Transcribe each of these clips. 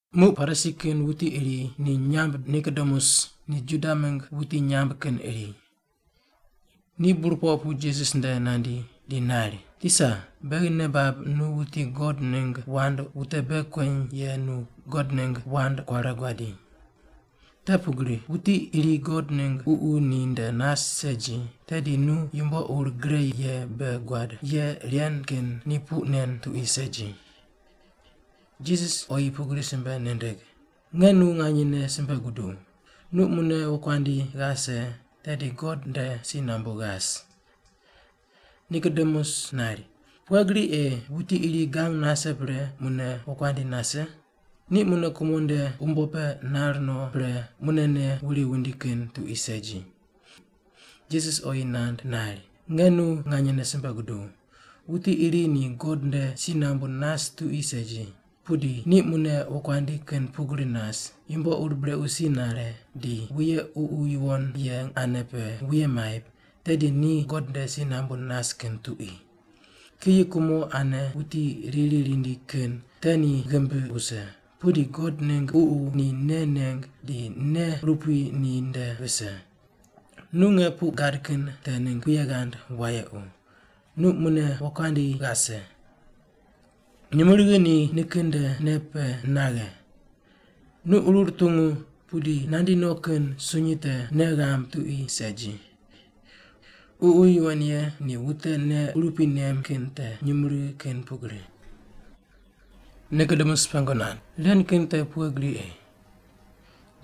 Muq Parisi kin wuti iri ni nyamb Nikodemus ni Juda mingg wuti nyamb kin iri. Ni burpoq pu Jisas nde nandi, di nari, “Tisa, beghi nei bab nu wuti God ningg wand wute bei kueny ye nu God ningg wand kuare guadi. Te pugri wuti iri God ningg Ququ ni nde nas segi, tedi nu yumbo ur gre ye bei guad ye ren kin ni puq nen tuqui segi.” Jisas oyi pugri simbe nindig, “Nge nu nganyene simbe guduw, nu mune wokuandi ghase tedi God nde si nambu ghas.” Nikodemus nari, “Pughe gri ei wuti iri gang nase pre mune wokuandi nase? Ni mune kumo nde umbo pe nar no pre munene wuri wundi kin tuqui segi.” Jisas oyi nand nari, “Nge nu nganyene simbe guduw, wuti iri ni God nde si nambu nas tuqui segi, pudi ni mune wokuandi kin pugri nas, yumbo ur brequ si nare, di wuye Ququ Yuwon Ye ane pe wuye maip, tedi ni God nde si nambu nas kin tuqui. Kiyi kumo ane wuti riri rindi kin te ni ghimbi wuse, pudi God ningg Ququ ni nei neng di nei urupui ni nde vise. Nu nge puq gad kin te ningg puye ghand wayequ, ‘Nu mune wokuandi ghase.’ Nyumurighi ni nikin nde nei pe naghe. Nu qurur tungu, pudi nandi no kin sunyi te nei ghamb tuqui segi. Ququ Yuwon Ye ni wute nei urupui nem kin te nyumurighi kin pugri.” Nikodemus pengu nand, “Ren kin te pughe gri ei?”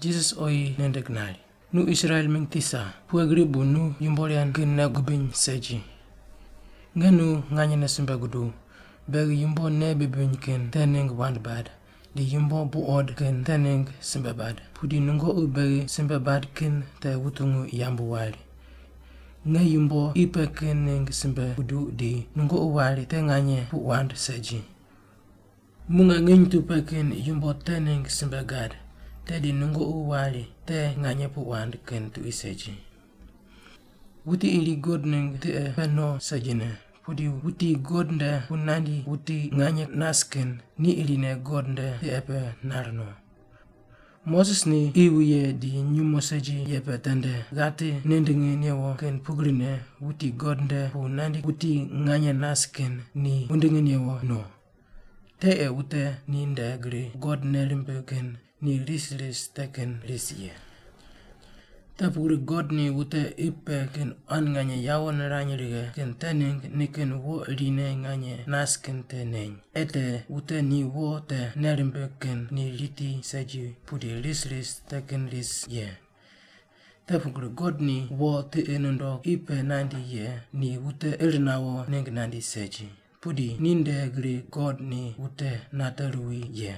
Jisas oyi nindig nari, “Nu Israel mingg tisa, pughe gri bu nu yumbo ren kin nei gubiny segi? Nge nu nganyene simbe guduw, beghi yumbo nei bibiny kin te ningg wand bad, di yumbo buqod kin te ningg simbe bad, pudi nungoqi beghi simbe bad kin te wutungu yambu wari. Nge yumbo qi pe kin ningg simbe guduq di nungoqi wari te nganye puq wand segi. Muq nge nginy tu pe kin yumbo te ningg simbe gad, tedi nungoqi wari te nganye puq wand kin tuqui segi. Wuti iri God ningg tiqe pe no segine, pudi wuti God nde pu nandi wuti nganye nas kin ni irine God nde tiqe pe nar no. Moses ni qi wuye di nyumo segi ye pe tende ghati nindingi newo kin pugrine wuti God nde pu nandi wuti nganye nas kin ni wundingi newo no, te ei wute ni nde gri God nei rimbig kin ni ris ris te kin ris ye. “Te pugri God ni wute qi pe kin quan nganye yawo nirany righe kin te ningg nikin wo irine nganye nas kin te neny, ei te wute ni wo te nei rimbig kin ni riti segi pudi ris ris te kin ris ye. Te pugri God ni wo tiqi nundog qi pe nandi ye ni wute ir nawo ningg nandi segi, pudi ni nde gri God ni wute nate ruwi ye.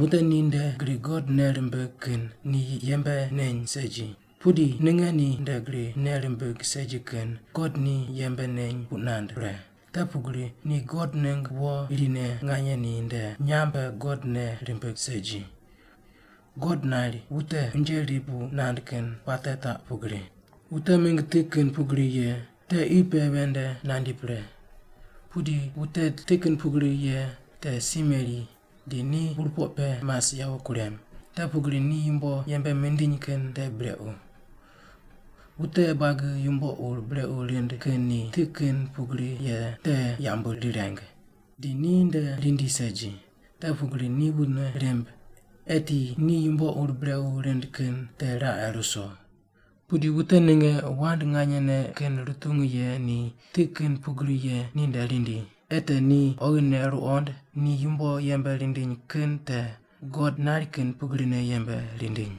Wute ni nde gri God nei rimbig kin ni yembe neny segi, pudi ninge ni nde gri nei rimbig segi kin God ni yembe neny puq nand pre, te pugri ni God ningg wo irine nganye ni nde nyamb pe God nei rimbig segi. God nari wute unje rip puq nand kin puate taq pugri: Wute mingg ti kin pugri ye te qi pe ven nde nandi pre, pudi wute ti kin pugri ye te si meri, di ni burpoq pe mas yawo kurem, te pugri ni yumbo yembe mindiny kin te brequ. Wute buagi yumbo ur brequ rind kin ni ti kin pugri ye te yambu rireng, di ni nde rindi segi, te pugri ni wune rimb, eti ni yumbo ur brequ rind kin te raqe ruso. Pudi wute ninge wand nganyene kin rutungu ye ni ti kin pugri ye ninde rindi, ei te ni oghine ruqond ni yumbo yembe rindiny kin te God nari kin pugrine yembe rindiny.”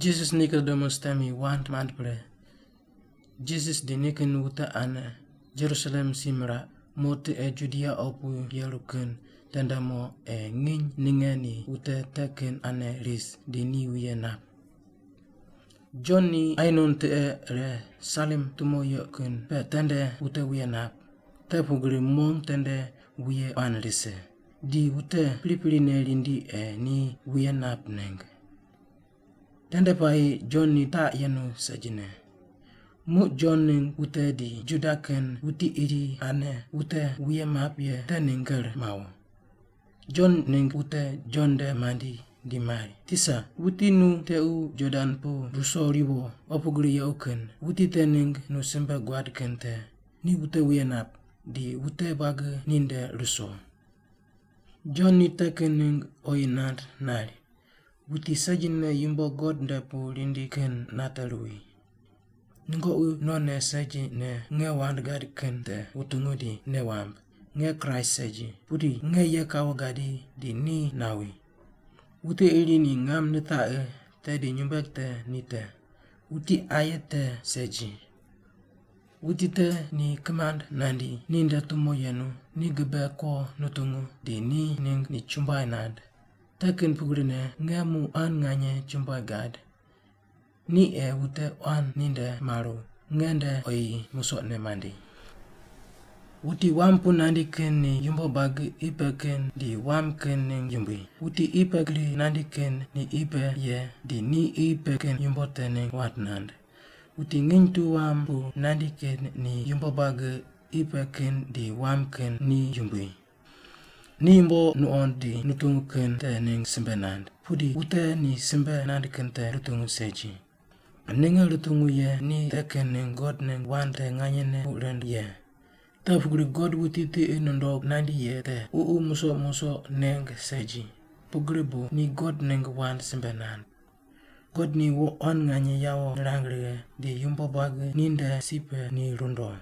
Jisas Nikodemus temi wand mand pre, Jisas di nikin wute ane Jerusalem si miraq, mo tiqe Judia opu yeru kin tende mo ei nginy ninge ni wute te kin ane ris, di ni wuye nap. Jon ni Ainon tiqe ire Salim tumo yequ kin pe tende wute wuye nap, te pugri mong tende wuye quan rise, di wute priprine rindi ei ni wuye nap ningg. (Tende puayi Jon ni taq yenu segine.) Muq Jon ningg wute di Juda kin wuti iri ane wute wuye map ye te ningg ker mawo. Jon ningg wute Jon nde mandi di mari, “Tisa, wuti nu tequ Jordan pu ruso ruwo opu gri yequ kin, wuti te ningg nu simbe guad kin te, ni wute wuye nap, di wute buagi ni nde ruso.” Jon ni te kin ningg oyi nand nari, “Wuti segine yumbo God nde pu rindi kin nate ruwi. Nungoqi nonne segine nge wand gad kin te wutungu di nei wamb, ‘Nge Kraist segi, pudi nge ye kawo gadi di ni nawi.’ Wuti iri ni ngam nitaqi, tedi nyumbueg te ni te. Wuti aye te segi. Wuti te ni kimand nandi, ni nde tumo yenu, ni gibe ko nutungu di te ningg ni chumbuai nand. Te kin pugrine nge muq quan nganye chumbuai gad. Ni ei wute quan ni nde maru, nge nde oyi musoqne mandi. “Wuti wam pu nandi kin ni yumbo buagi qi pe kin di wam kin ningg yumbui, wuti qi pe gri nandi kin ni qi pe ye, di ni qi pe kin yumbo te ningg wand nand. Wuti nginy tu wam pu nandi kin ni yumbo buagi qi pe kin di wam kin ni yumbui. Ni yumbo nuqond di nutungu kin te ningg simbe nand, pudi wute ni simbe nand kin te rutungu segi. Ninge rutungu ye ni te kin ningg God ningg wand te nganyene puq rind ye. Te pugri God wuti tiqi nundog nandi ye te Ququ musoq musoq neng segi, pugri bu ni God ningg wand simbe nand. God ni wo quan nganye yawo nirang righe, di yumbo buagi ni nde si pe ni rundo.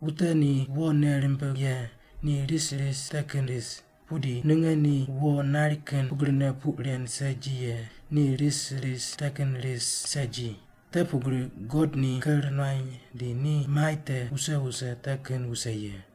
Wute ni wo nei rimbig ye ni ris ris te kin ris, pudi ninge ni wo nari kin pugrine puq ren segi ye ni ris ris te kin ris segi, te pugri God ni ker nuany di ni mai te wuse wuse te kin wuse ye.”